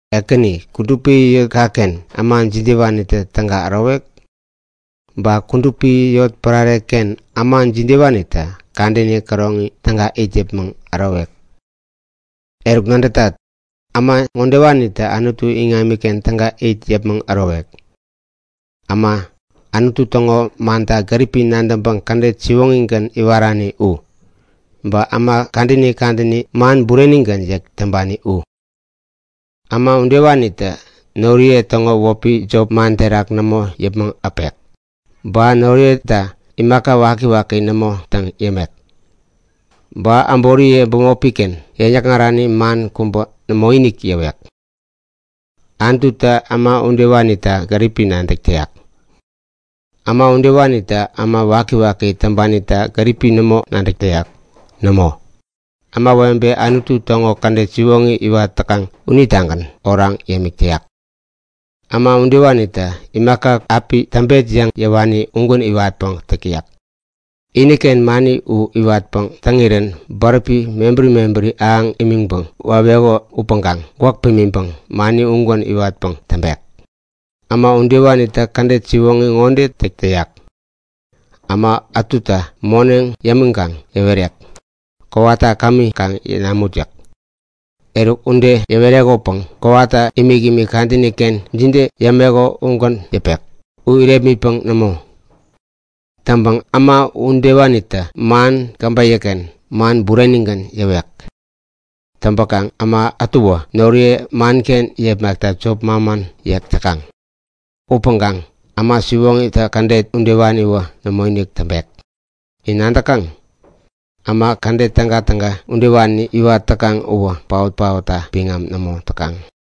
Ekäni, kudupi yotkaken äma jidewanitä täga ärowek? Ba kudupi yotpärarekaken äma jidewanitä kadäni käroŋi täga it yäpmäŋ ärowek? Eruk, nadätat, äma ŋodewanitä Anutu iŋamiken täga it yäpmäŋ ärowek; Äma, Anutu täŋo manta gäripi nadäŋpäŋ kädet siwoŋigän iwarani u. Ba äma kadäni kadäni man burenigän yäk täŋpani u. Äma udewanitä noriye täŋo wäpi jop man terak nämo yäpmäŋ äpek. Ba noriyeta imaka wakiwaki nämo täŋ yämek. Ba äboriye bämopiken yäŋ-yäkŋarani man kubä nämoinik yäwek. Anututä äma udewanita gäripi nadäk täyak. Äma udewanitä äma wakiwaki täŋpanita gäripi nämo nadäk täyak. Nämo! Ämawebe Anutu täŋo kädet siwoŋi iwat täkaŋ unitagän oraŋ yämik täyak. Äma udewanitä imaka api täŋpet yäŋ yäwani ugän iwatpäŋ täk täyak. Iniken mani u iwatpäŋ täŋirän bäräpi mebäri mebäri ahäŋ imäpäŋ waweko upäŋkaŋ gwäk pimiŋpäŋ mani ugän iwatpäŋ täŋpek. Äma udewanitä kädet siwoŋi ŋode täk täyak; Äma ätuta moneŋ yämiŋkaŋ yäwerek; Kowata kämi kaŋ namut yäk. Eruk ude yäwerekopäŋ kowata imikimik kadänikenä jide yämeko udegän yäpek, u irepmitpäŋ nämo. Täŋpäŋ äma udewanitä man käbeyäken man burenigän yäwek. Täŋpäkaŋ äma ätuwä noriye manken yepmakta jop manman yäk täkaŋ. Upäŋkaŋ äma siwoŋitä kädet udewaniwä nämoinik täŋpek. In nadäkaŋ? Äma kädet tägatäga udewani iwat täkaŋ uwä paot-paotta biŋam nämo täkaŋ.